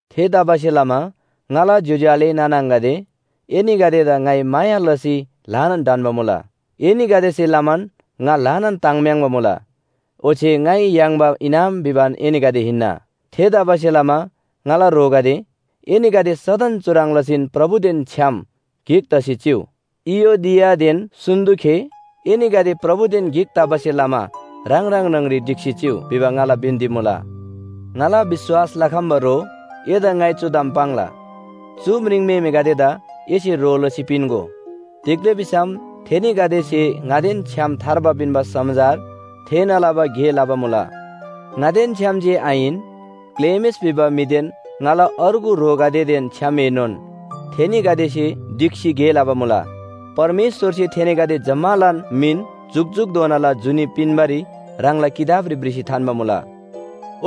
थेतबासेलमा ङाला ज्‍योज्‍यो आले नाना आङागदे, एनीगदेदा ङाइ माया लसी ल्‍हानान ढन्‍बा मुला। एनीगदेसे लमान ङा ल्‍हानान ताङ्म्‍याङ्बा मुला, ओच्‍छे ङाइ याङ्बा इनाम भिबान एनीगदे हिन्‍ना। थेतबासेलमा ङाला ह्रोगदे, एनीगदे सदन चुह्रङ् लसीन प्रभुदेन छ्‌याम गिक तसी चिउ। इयोदियादेन सुन्‍तुखे, एनीगदे प्रभुदेन गिक तबासे लमा ह्राङ ह्राङ न्‍हङरी ढिक्‍सी चिउ भिबा ङाला बिन्‍ती मुला। ङाला विश्‍वास लखम्‍बा ह्रो, एदा ङाइ चु ताम पाङ्ला, चु म्रिङम्‍हेमेगदेदा एसे ह्रो लसी पिन्‍गो। तिग्‍दा भिसम थेनीगदेसे ङादेन छ्‌याम थार्बा पिन्‍बा समाचार थेःना लबा गे लबा मुला। ङादेन छ्‌याम जे आहिन, क्‍लेमेस भिबा म्‍हिदेन ङाला अर्गु ह्रोगदेदेन छ्‌यामएनोन थेनीगदेसे ढिक्‍सी गे लबा मुला। परमेश्‍वरसे थेनीगदे जम्‍मालान मिन जुकजुकधोनाला जुनी पिन्‍बारी ह्राङला किताबरी भ्रिसी थान्‍बा मुला।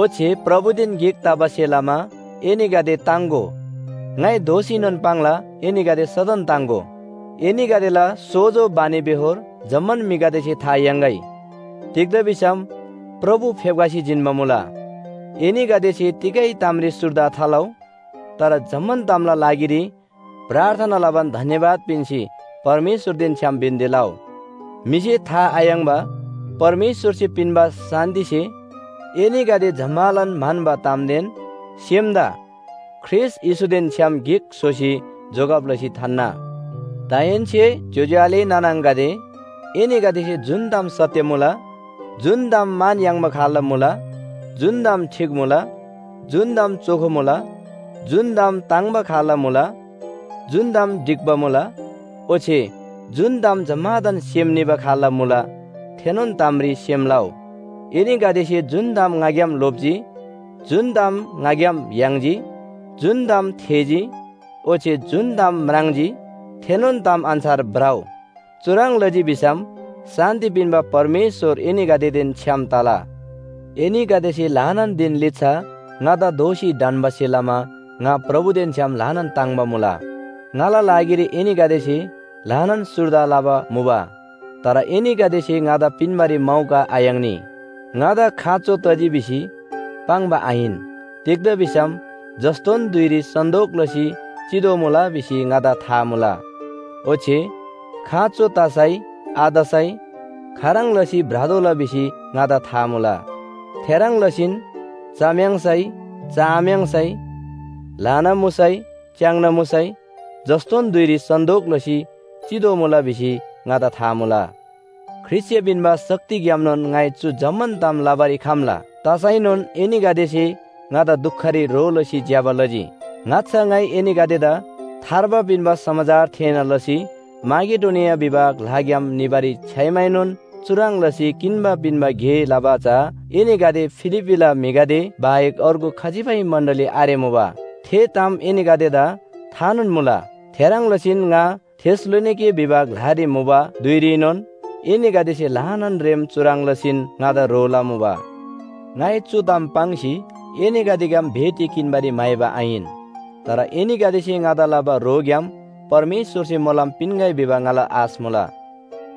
ओच्‍छे प्रभुदेन गिक तबासे लमा एनीगदे ताङ्‍गो, ङाइ दोःसीनोन पाङ्ला एनीगदे सदन ताङ्‍गो। एनीगदेला सोजो बानीबेहोर जम्‍मान म्‍हिगदेसे था याङ्‌गै। तिग्‍दा भिसम प्रभु फेप्‍खसी जिन्‍बा मुला। एनीगदेसे तिगै तामरी सुर्दा थालउ। तर जम्‍मान तामला लागिरी प्रार्थना लबान धन्‍यवाद पिन्‍सी परमेश्‍वरदेन छ्‌याम बिन्‍ती लउ। म्‍हिसे था आयाङ्‍बा परमेश्‍वरसे पिन्‍बा शान्‍तिसे एनीगदे जम्‍मालान म्‍हन्‍बा तामदेन सेमदा ख्रीष्‍ट येशूदेन छ्‌याम गिक स्‍होसी जोगब लसी थान्‍ना। दाहेन्‍से ज्‍योज्‍यो आले नाना आङागदे, एनीगदेसे जुन ताम सत्‍य मुला, जुन ताम मान याङ्बा खाल्‍ला मुला, जुन ताम ठीक मुला, जुन ताम चोखो मुला, जुन ताम ताङ्‍बा खाल्‍ला मुला, जुन ताम ढिक्‍बा मुला ओच्‍छे जुन ताम जम्‍मादान सेम निबा खाल्‍ला मुला थेनोन तामरी सेम लउ। एनीगदेसे जुन ताम ङाग्‍याम लोप्‍जी, जुन ताम ङाग्‍याम याङ्जी, जुन ताम थेःजी ओच्‍छे जुन ताम म्राङ्जी, थेनोन ताम अन्‍छार भ्रउ। चुह्रङ् लजी भिसम शान्‍ति पिन्‍बा परमेश्‍वर एनीगदेदेन छ्‌याम तला। एनीगदेसे ल्‍हानान धिन लिच्‍छा ङादा दोःसी ढन्‍बासे लमा ङा प्रभुदेन छ्‌याम ल्‍हानान ताङ्‍बा मुला। ङाला लागिरी एनीगदेसे ल्‍हानान सुर्दा लबा मुबा। तर एनीगदेसे ङादा पिन्‍बारी मौका आयाङ्नी। ङादा खाँचो तजी भिसी पाङ्बा आहिन। तिग्‍दा भिसम जस्‍तोन धुइरी सन्‍तोक लसी चितोःमुला भिसी ङादा था मुला। ओच्‍छे खाँचो तसै आतसै खाह्रङ् लसी भ्रतोःला भिसी ङादा था मुला। थेह्रङ् लसीन चम्‍याङ्सै चआम्‍याङ्सै, ल्‍हाना मुसै च्‍याङ्ना मुसै जस्‍तोन धुइरी सन्‍तोक लसी चितोःमुला भिसी ङादा था मुला। ख्रीष्‍टसे पिन्‍बा शक्तिग्‍यामनोन ङाइ चु जम्‍मान ताम लबारी खम्‍ला। तसैनोन एनीगदेसे ङादा दुखरी ह्रो लसी ज्‍यबा लजी। ङाच्‍छा ङाइ एनीगदेदा थार्बा पिन्‍बा समाचार थेःना लसी माकेडोनिया भिबा ग्‍लाग्‍याम निबारी छ्‌याइमाएनोन चुह्रङ् लसी किन्‍बा पिन्‍बा गे लबा चा एनीगदे फिलिप्‍पीला म्‍हिगदे बाहेक अर्गु खजिबै मण्‍डली आरेमुबा। थे ताम एनीगदेदा थानोन मुला। थेह्रङ् लसीन ङा थेसलोनिके भिबा ग्‍लारी मुबा धुइरीनोन एनीगदेसे ल्‍हानान रेम चुह्रङ् लसीन ङादा ह्रो लमुबा। ङाइ चु ताम पाङ्सी एनीगदेग्‍याम भेटी किन्‍बारी म्‍हाइबा आहिन। तर एनीगदेसे ङादा लबा ह्रोग्‍याम परमेश्‍वरसे मोलम पिन्‍गै भिबा ङाला आश मुला।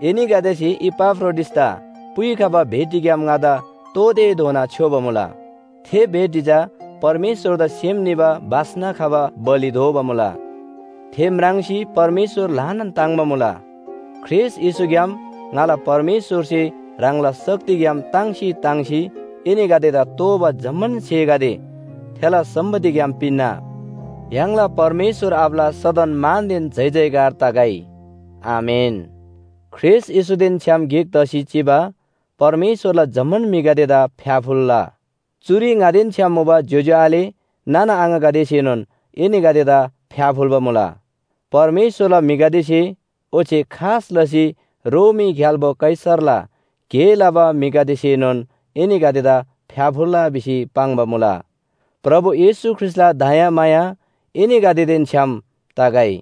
एनीगदेसे इपाफ्रोडिटसदा पुइखबा भेटीग्‍याम ङादा तोःतेधोना छ्‌योबा मुला। थे भेटी चा परमेश्‍वरदा सेम निबा बास्‍ना खबा बलि दोबा मुला। थे म्राङ्सी परमेश्‍वर ल्‍हानान ताङ्‍बा मुला। ख्रीष्‍ट येशूग्‍याम ङाला परमेश्‍वरसे ह्राङला शक्तिग्‍याम ताङ्सी ताङ्सी एनीगदेदा तोःबा जम्‍मान स्‍हेगदे थेला सम्‍पत्तिग्‍याम पिन्‍ना। य्‍हाङला परमेश्‍वर आबाला सदन मानदेन जयजयकार तगै। आमेन। ख्रीष्‍ट येशूदेन छ्‌याम गिक तसी चिबा परमेश्‍वरला जम्‍मान म्‍हिगदेदा फ्‍याफुल्‍ला। चुरी ङादेन छ्‌याम मुबा ज्‍योज्‍यो आले नाना आङागदेसेनोन एनीगदेदा फ्‍याफुल्‍बा मुला। परमेश्‍वरला म्‍हिगदेसे ओच्‍छे खास लसी रोमी ग्‍याल्‍बो कैसरला गे लबा म्‍हिगदेसेनोन एनीगदेदा फ्‍याफुल्‍ला भिसी पाङ्बा मुला। प्रभु येशू ख्रीष्‍टला दयामाया एनीगदेदेन छ्‌याम तगै।